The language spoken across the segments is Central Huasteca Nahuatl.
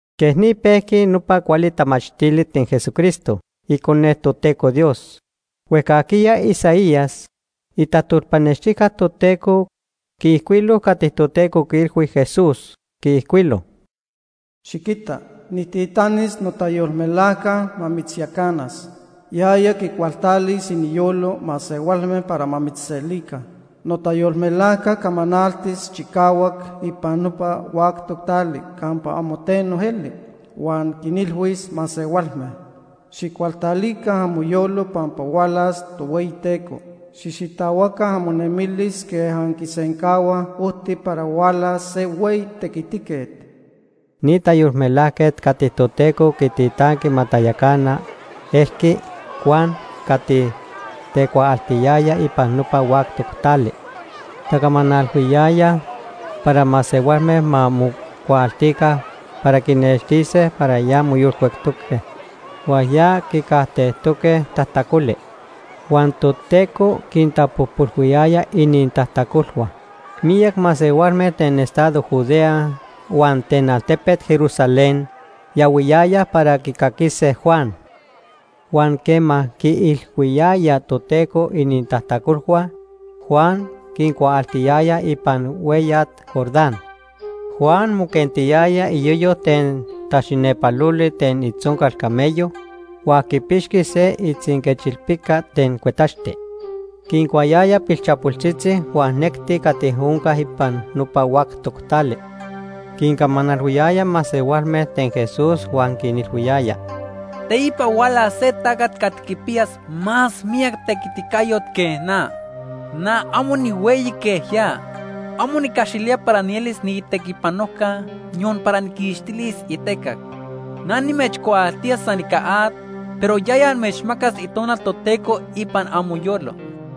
Quej ni pejqui nopa cuali tamachtili ten Jesucristo, Icone Toteco Dios. Huejcajquiya Isaías, itajtolpanextijca Toteco, quiijcuilo cati Toteco quiilhui Jesús. Quiijcuilo: “Xiquita nijtitanis notayolmelajca ma mitzyacanas. Yaya quicualtalis iniyolo masehualme para ma mitzselica. Notayolmelajca camanaltis chicahuac ipan nopa huactoc tali campa amo teno eli, huan quinilhuis masehualme: ‘Xijcualtalica amoyolo pampa hualas Tohueyiteco. Xijxitahuaca amonemilis quej anquisencahuaj ojti para hualas se hueyi tequitiquet.’” Ni tayolmelajquet cati Toteco quititanqui ma tayacana elqui Juan cati tecuaaltiyaya ipan nopa huactoc tali. Tacamanalhuiyaya para masehualme ma mocuaaltica para quinextise para ya moyolcuectoque huan ya quicajtejtoque tajtacoli. Huan Toteco quintapojpolhuiyaya inintajtacolhua. Miyac masehualme ten estado Judea huan ten altepet Jerusalén yahuiyayaj para quicaquise Juan. Huan quema quiilhuiyayaj Toteco inintajtacolhua, Juan quincuaaltiyaya ipan hueyat Jordán. Juan moquentiyaya iyoyo ten taxinepaloli ten itzoncal camello huan quipixqui se itzinquechilpica ten cuetaxti. Quincuayaya pilchapoltzitzi huan necti cati onca ipan nopa huactoc tali. Quincamanalhuiyaya masehualme ten Jesús huan quinilhuiyaya: “Teipa hualas se tacat cati quipiyas más miyac itequiticayo que na. Na amo nihueyi quej ya. Amo nicaxilía para nielis niitequipanojca, yon para nijquixtilis itecac. Na nimechcuaaltía san ica at, pero yaya amechmacas Itonal Toteco ipan amoyolo.”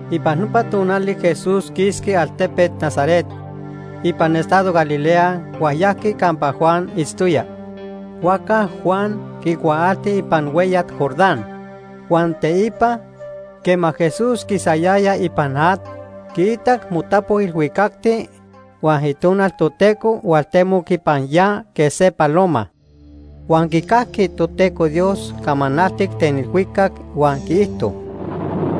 Ipan nopa tonali Jesús quisqui altepet Nazaret ipan estado Galilea huan yajqui campa Juan itztoya, huajca Juan quicuaalti ipan hueyat Jordán. Huan teipa, quema Jesús quisayaya ipan at, quiitac motapo ilhuicacti huan Itonal Toteco hualtemoc ipan ya quej se paloma. Huan quicajqui Toteco Dios camanaltic ten ilhuicac huan quiijto: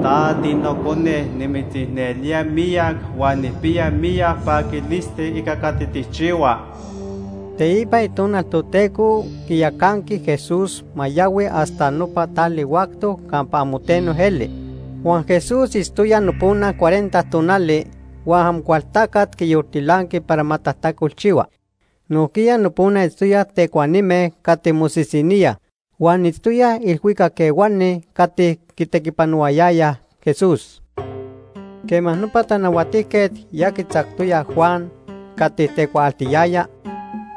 “Ta tiNocone, nimitzicnelía miyac huan nijpiya miyac paquilisti ica cati tijchihua.” Teipa Itonal Toteco quiyacanqui Jesús ma yahui hasta nopa tali huactoc campa amo teno eli. Huan Jesús itztoya nopona cuarenta tonali huan Amocualtacat quiyoltilanqui para ma tajtacolchihua. Nojquiya nopona itztoyaj tecuanime cati mosisiníaj, huan itztoyaj ilhuicac ehuani cati quitequipanohuayayaj Jesús. Quema nopa tanahuatijquet ya quitzactoya Juan cati tecuaaltiyaya,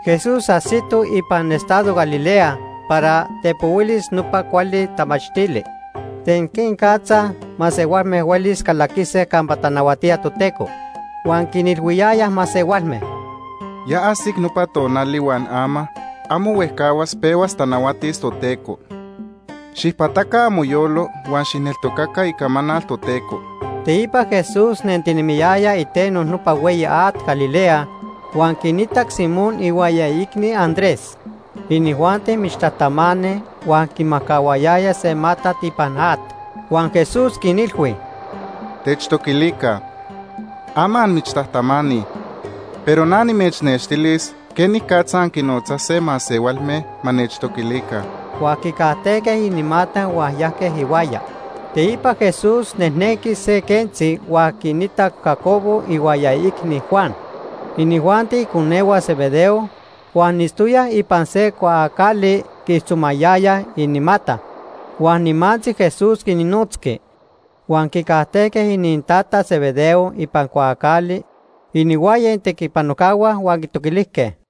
Jesús ajsito ipan estado Galilea para tepohuilis nopa cuali tamachtili ten quenicatza masehualme huelis calaquise campa tanahuatía Toteco. Huan quinilhuiyaya masehualme: “Ya ajsic nopa tonali huan ama, amo huejcahuas pehuas tanahuatis Toteco. Xijpataca amoyolo huan xijneltocaca icamanal Toteco.” Teipa Jesús nentinemiyaya iteno nopa hueyi at Galilea huan quinitac Simón ihuaya iicni, Andrés. Inijuanti michtajtamani huan quimajcahuayayaj se matat ipan at. Huan Jesús quinilhui: ―Techtoquilica. Ama anmichtajtamani, pero na nimechnextilis quenicatza anquinnotzase masehualme ma nechtoquilica. Huan quicajtejque inimata huan yajque ihuaya. Teipa Jesús nejnenqui se quentzi huan quinitac Jacobo ihuaya iicni, Juan. Inijuanti iconehua Zebedeo, huan itztoyaj ipan se cuaacali quiijtzomayayaj inimata. Huan nimantzi Jesús quinnotzqui. Huan quicajtejque inintata Zebedeo ipan cuaacali inihuaya itequipanojcahua huan quitoquilijque.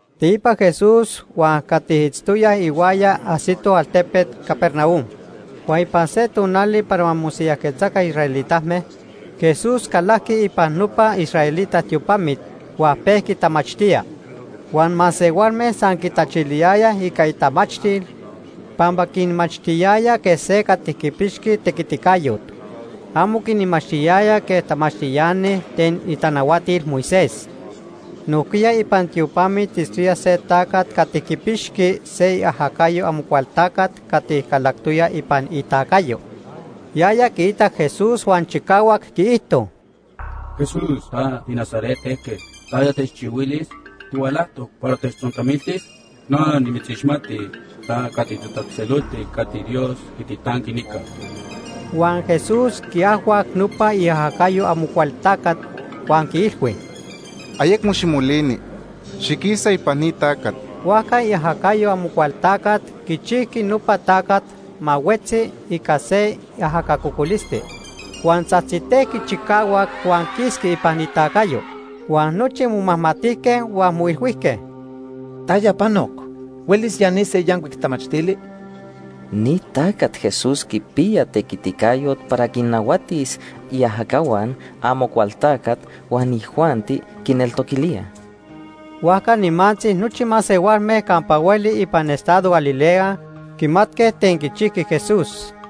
Teipa Jesús huan cati itztoyaj ihuaya ajsitoj altepet Capernaum. Huan ipan se tonali para ma mosiyajquetzaca israelitame, Jesús calajqui ipan nopa israelita tiopamit, huan pejqui tamachtía. Huan masehualme san quitachiliyayaj ica itamachtil, pampa quinmachtiyaya quej se cati quipixqui tequiticayot. Amo quinmachtiyaya quej tamachtiani ten itanahuatil Moisés. Nojquiya ipan tiopamit itztoya se tacat cati quipixqui se iajacayo Amocualtacat cati calactoya ipan itacayo. Yaya quiitac Jesús huan chicahuac quiijto: ―Jesús ta tiNazaret ejquet, ¿taya techchihuilis? ¿Tihualajtoc para techtzontamiltis? Na nimitzixmati. Ta cati titatzejtzeloltic cati Dios quititanqui nica. Huan Jesús quiajhuac nopa iajacayo Amocualtacat huan quiilhui: ―Ayecmo ximolini. Xiquisa ipan ni tacat. Huajca iajacayo Amocualtacat quichijqui nopa tacat ma huetzi ica se ajaca cocolisti. Huan tzajtzitejqui chicahuac huan quisqui ipan itacayo. Huan nochi momajmatijque huan moilhuijque: ―¿Taya panoc? ¿Huelis ya ni se yancuic tamachtili? ¡Ni tacat Jesús quipiya tequiticayot para quinnahuatis iajacahua Amocualtacat huan inijuanti quineltoquilíaj! Huajca nimantzi nochi masehualme campa hueli ipan estado Galilea quimatque ten quichijqui Jesús.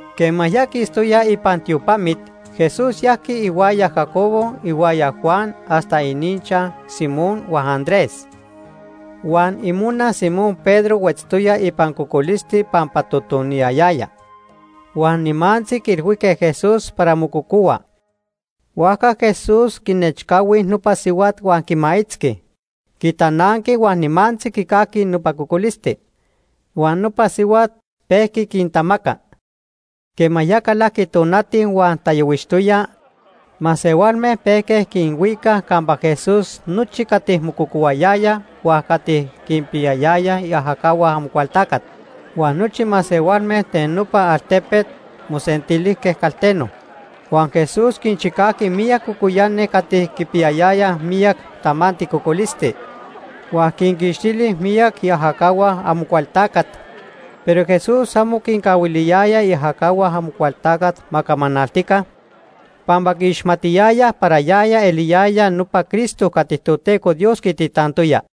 Quema ya quistoyaj ipan tiopamit, Jesús yajqui ihuaya Jacobo ihuaya Juan hasta ininchaj Simón huan Andrés. Huan imona Simón Pedro huetztoya ipan cocolisti pampa totoniyayaya. Huan nimantzi quiilhuijque Jesús para mococohua. Huajca Jesús quinechcahui nopa sihuat huan quimaitzqui. Quitananqui huan nimantzi quicajqui nopa cocolisti. Huan nopa sihuat pejqui quintamaca. Quema ya calajqui tonati huan tayohuixtoya, masehualme pejque quinhuicaj campa Jesús nochi cati mococohuayayaj huan cati quinpiyayayaj iajacahua Amocualtacat. Huan nochi masehualme ten nopa altepet mosentilijque calteno. Huan Jesús quinchicajqui miyac cocoyani cati quipiyayayaj miyac tamanti cocolisti. Huan quinquixtili miyac iajacahua Amocualtacat. Pero Jesús amo quincahuiliyaya iajacahua Amocualtacat ma camanaltica, pampa quiixmatiyayaj para yaya eliyaya nopa Cristo cati Toteco Dios quititantoya.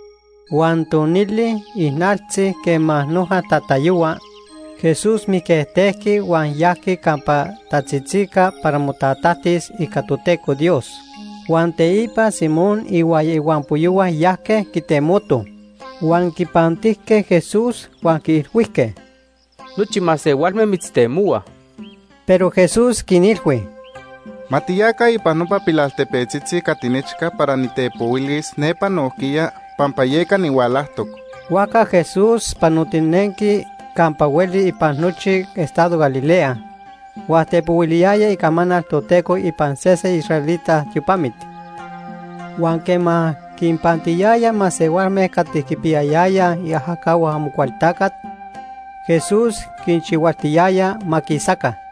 Huan tonili ijnaltzi quema noja tatayohua, Jesús mijquejtejqui huan yajqui campa tatzitzica para motatajtis ica Toteco Dios. Huan teipa Simón ihuaya ihuampoyohua yajque quitemotoj. Huan quipantijque Jesús, huan quiilhuijque: ―Nochi masehualme mitztemohuaj. Pero Jesús quinilhui: ―Ma tiyaca ipan nopa pilaltepetzitzi cati nechca para nitepohuilis nepa nojquiya pampa yeca nihualajtoc. Huajca Jesús panotinenqui campa hueli ipan nochi estado Galilea, huan tepohuiliyaya icamanal Toteco ipan sese israelita tiopamit. Huan quema quinpantiyaya masehualme cati quipiyayayaj iajacahua Amocualtacat, Jesús quinchihualtiyaya ma quisaca.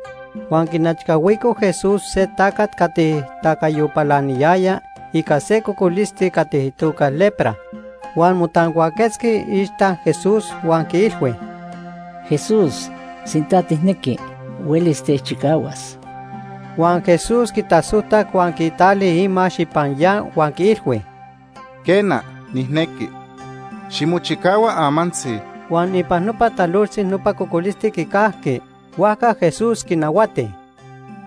Huan quinechcahuico Jesús se tacat cati tacayo palaniyaya ica se cocolisti cati itoca lepra. Huan motancuaquetzqui iixta Jesús huan quiilhui: ―Jesús, sinta tijnequi, huelis techchicahuas. Huan Jesús quitasojtac huan quitali imax ipan ya huan quiilhui: ―Quena, nijnequi. Ximochicahua amantzi. Huan ipan nopa talojtzi nopa cocolisti quicajqui. Huajca Jesús quinahuati: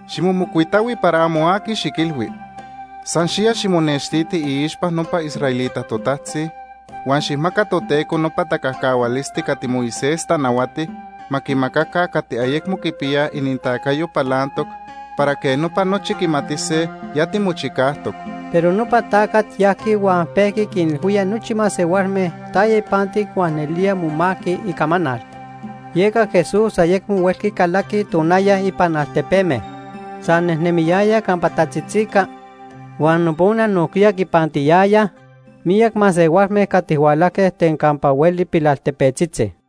―Ximomocuitahui para amo aqui xiquilhui. San xiya ximonextiti iixpa nopa israelita totajtzi, huan xijmaca Toteco nopa tacajcahualisti cati Moisés tanahuati ma quimacaca cati ayecmo quipiyaj inintacayo palantoc para quej nopa nochi quimatise ya timochicajtoc. Pero nopa tacat yajqui huan pejqui quinilhuía nochi masehualme taya ipantic huan nelía momajqui icamanal. Yeca Jesús ayecmo huelqui calaqui tonaya ipan altepeme. San nejnemiyaya campa tatzitzica huan nopona nojquiya quipantiyayaj miyac masehualme cati hualajque ten campa hueli pilaltepetzitzi.